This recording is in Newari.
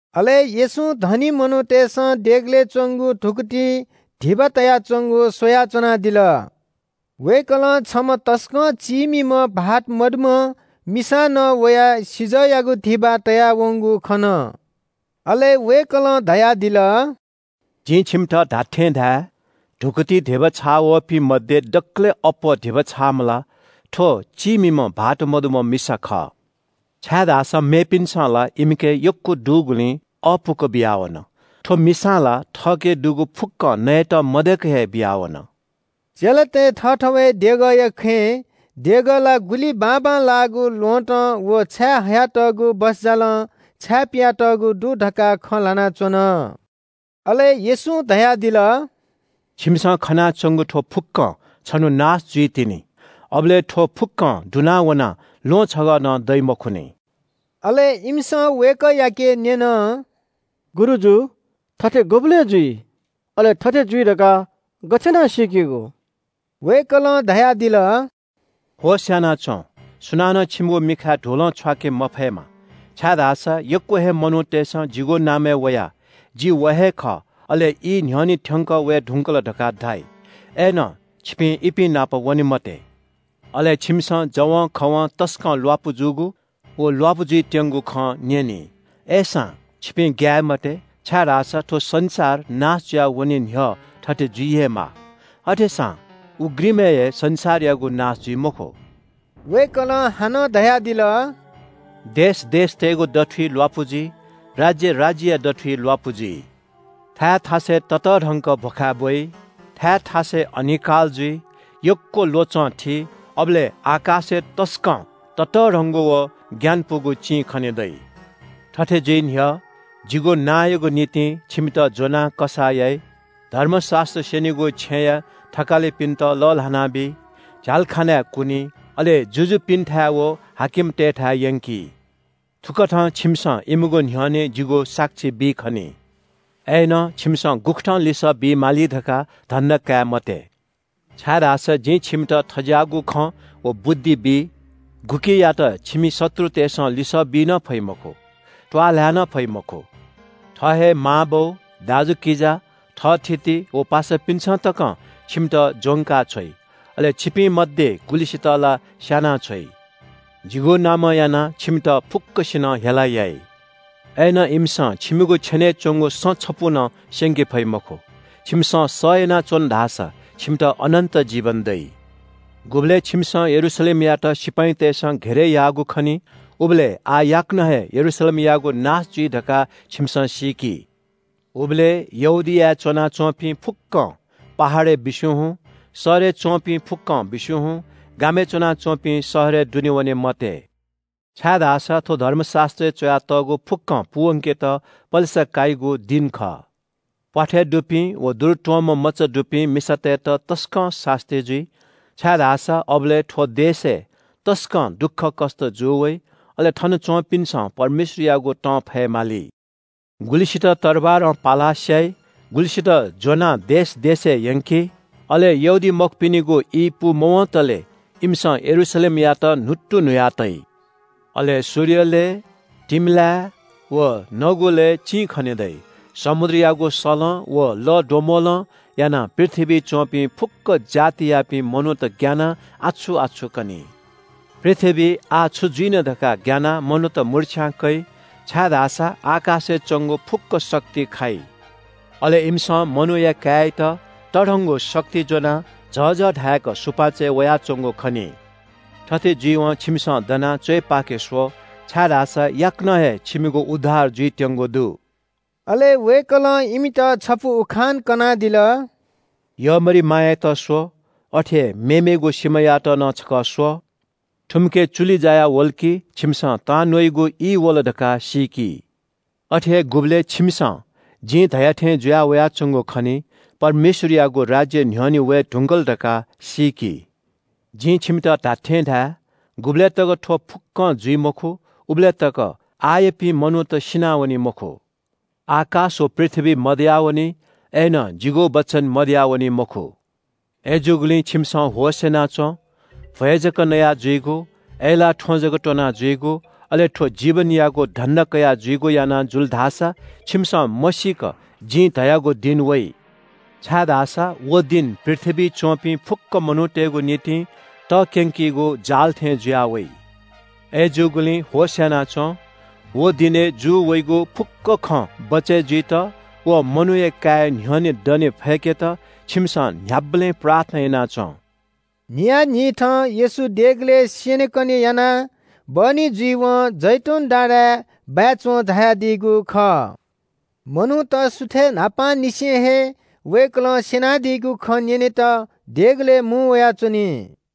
अले येशूं धनी मनूतय्‌सं देगलय् च्‍वंगु धुकुतिइ धिबा तयाच्‍वंगु स्‍वया च्‍वनादिल। वय्‌कलं छम्‍ह तसकं चीमिम्‍ह भाःत सीधुंकूम्‍ह मिसां नं वयाः सिजःयागु धिबा तयावंगु खन। अले वय्‌कलं धयादिल – “जिं छिमित धात्‍थें धाये – धुकुतिइ धिबा छाःवःपिं मध्‍ये दकलय् अप्‍वः धिबा छाःम्‍ह ला थ्‍व चीमिम्‍ह भाःत सीधुंकूम्‍ह मिसा खः। छाय्‌धाःसा मेपिन्‍सं ला इमिके यक्‍व दुगुलिं अःपुक बियावन। थ्‍व मिसां ला थःके दुगु फुक्‍कं नयेत मदय्‌क हे बियावन।” चेलातय् थःथवय् देगःया खँय् देगः ला गुलि बाबांलाःगु ल्‍वहँतं व छायेहयातःगु बसजालं छाय्‌पिया तःगु दु धकाः खँ ल्‍हानाच्‍वन। अले येशूं धयादिल – “छिमिसं खनाच्‍वंगु थ्‍व फुक्‍कं छन्‍हु नाश जुइतिनि, अबलय् थ्‍व फुक्‍कं दुना वनाः ल्‍वहं छगः नं दइ मखुनि।” अले इमिसं वय्‌कःयाके न्‍यन – “गुरुजु, थथे गुबलय् जुइ? अले थथे जुइ धकाः गथे याना सीकेगु?” वय्‌कलं धयादिल – “होश‍ यानाच्‍वँ, सुनानं छिमिगु मिखाय् धुलं छ्वाके मफयेमा, छाय्‌धाःसा यक्‍व हे मनूतय्‌सं जिगु नामय् वयाः – ‘जि व हे खः’ अले ‘ई न्‍ह्यःने थ्‍यंकः वये धुंकल’ धकाः धाइ। अय्‌नं छिपिं इपिं नाप वने मते। अले छिमिसं जवंखवं तसकं ल्‍वापु जूगु व ल्‍वापु जुइत्‍यंगु खँ न्‍यनी। अय्‌सां छिपिं ग्‍याये मते, छाय्‌धाःसा थ्‍व संसार नाश जुयावने न्‍ह्यः थथे जुइ हे माः। अथेसां उघ्रिमय् हे संसारयागु नाश जुइ मखु।” वय्‌कलं हानं धयादिल – “देश देशतय्‌गु दथुइ ल्‍वापु जुइ। राज्‍य राज्‍यया दथुइ ल्‍वापु जुइ। थाय् थासय् ततःधंक भ्‍वखाय् ब्‍वइ, थाय् थासय् अनिकाल जुइ, यक्‍व ल्‍वचं थी, अबलय् आकाशय् तसकं ततःधंगु व ग्‍यानापुगु चिं खने दइ। “थथे जुइ न्‍ह्यः जिगु नांयागु निंतिं छिमित ज्‍वनाः कसाः याइ, धर्मशास्‍त्र स्‍यनीगु छेँया थकालिपिन्‍त लःल्‍हानाबी, झ्‍यालखानाय् कुनी, अले जुजुपिन्‍थाय् व हाकिमतय्‌थाय् यंकी। थुकथं छिमिसं इमिगु न्‍ह्यःने जिगु साक्षी बी खनी। अय्‌नं छिमिसं गुकथं लिसः बी माली धकाः धन्‍दा काये मते, छाय्‌धाःसा जिं छिमित थज्‍याःगु खँ व बुद्धि बी, गुकियात छिमि शत्रुतय्‌सं लिसः बी नं फइ मखु, त्‍वाःल्‍हाय् नं फइ मखु। थः हे मांबौ, दाजुकिजा, थःथिति व पासापिन्‍सं तकं छिमित ज्‍वंका छ्वइ, अले छिपिं मध्‍ये गुलिसित ला स्‍यानाछ्वइ। जिगु नामं यानाः छिमित फुक्‍कसिनं हेला याइ। अय्‌नं इमिसं छिमिगु छेनय् च्‍वंगु सँ छपु नं स्‍यंके फइ मखु। छिमिसं सह यानाच्‍वन धाःसा छिमित अनन्‍त जीवन दइ।” “गुबलय् छिमिसं यरूशलेमयात सिपाइँतय्‌सं घेरय् याःगु खनी, उबलय् आः याकनं हे यरूशलेमयागु नाश जुइ धकाः छिमिसं सीकि। उबलय् यहूदियाय् च्‍वनाच्‍वंपिं फुक्‍कं पहाडय् बिस्‍युं हुँ, शहरय् च्‍वंपिं फुक्‍कं बिस्‍युं हुँ, गामय् च्‍वनाच्‍वंपिं शहरय् दुने वने मते। छाय्‌धाःसा थ्‍व धर्मशास्‍त्रय् च्‍वयातःगु फुक्‍कं पूवंकेत पलेसा काइगु दिं खः। प्‍वाथय् दुपिं व दुरुत्‍वंम्‍ह मचा दुपिं मिसातय्‌त तसकं सास्‍ती जुइ। छाय्‌धाःसा अबलय् थ्‍व देशय् तसकं दुःखकष्‍ट जू वइ, अले थन च्‍वंपिन्‍सं परमेश्‍वरयागु तं फयेमाली। गुलिसित तरवारं पालाः स्‍याइ, गुलिसित ज्‍वनाः देश देशय् यंकी, अले यहूदीमखुपिनिगु ई पूमवंतले इमिसं यरूशलेमयात न्‍हुत्तुन्‍हुया तइ।” “अले सूर्यलय्, तिमिलाय् व नगुलय् चिं खने दइ। समुद्रयागु सलं व लःद्वम्‍बलं यानाः पृथ्‍वीइ च्‍वंपिं फुक्‍क जातयापिं मनूत ग्‍यानाः आछु-आछु कनी। पृथ्‍वीइ आः छु जुइन धकाः ग्‍यानाः मनूत मुर्च्‍छां कइ, छाय्‌धाःसा आकाशय् च्‍वंगु फुक्‍क शक्ति खाइ। अले इमिसं मनूया काय्‌यात तःधंगु शक्ति ज्‍वनाः झःझः धाय्‌क सुपाँचय् वयाच्‍वंगु खनी। थथे जुइवं छिमिसं दनाः च्‍वय् पाखे स्‍व, छाय्‌धाःसा याकनं हे छिमिगु उद्धार जुइत्‍यंगु दु।” अले वय्‌कलं इमित छपु उखान कनादिल – “यःमरिमायात स्‍व, अथे हे मेमेगु सिमायात नं छकः स्‍व। थुमिके चुलि जायावल कि, छिमिसं ‘तांन्‍वःगु ई वल’ धकाः सीकी। अथे हे गुबलय् छिमिसं जिं धया थें जुया वयाच्‍वंगु खनी, परमेश्‍वरयागु राज्‍य न्‍ह्यःने वये धुंकल धकाः सीकि। जिं छिमित धात्‍थें धाये – गुबलय् तक थ्‍व फुक्‍कं जुइ मखु, उबलय्‌तक आःयापिं मनूत सिनावनी मखु। आकाश व पृथ्‍वी मदयावनी, अय्‌नं जिगु वचन मदयावनी मखु।” “अय्‌जूगुलिं छिमिसं होश‍ यानाच्‍वँ। भ्‍वय् जक नया जुइगु, अय्‌लाः थ्‍वँ जक त्‍वना जुइगु, अले थ्‍व जीवनयागु धन्‍दा कयाः जुइगु याना जुल धाःसा छिमिसं मसीक जिं धयागु दिं वइ। छाय्‌धाःसा व दिं पृथ्‍वीइ च्‍वंपिं फुक्‍क मनूतय्‌गु निंतिं तक्‍यंकीगु जाल थें जुयाः वइ। अय्‌जूगुलिं होश‍ यानाच्‍वँ। व दिनय् जू वइगु फुक्‍क खं बचय् जुइत व मनूया काय्‌या न्‍ह्यःने दने फय्‌केत छिमिसं न्‍ह्याबलें प्रार्थना याना च्‍वँ।” न्‍हियान्‍हिथं येशू देगलय् स्‍यनेकने यानाः बहनी जुइवं जैतून डाँडाय् बाय् च्‍वं झायादीगु खः। मनूत सुथय् न्‍हापांनिसें हे वय्‌कलं स्‍यनादीगु खँ न्‍यनेत देगलय् मुं वयाच्‍वनी।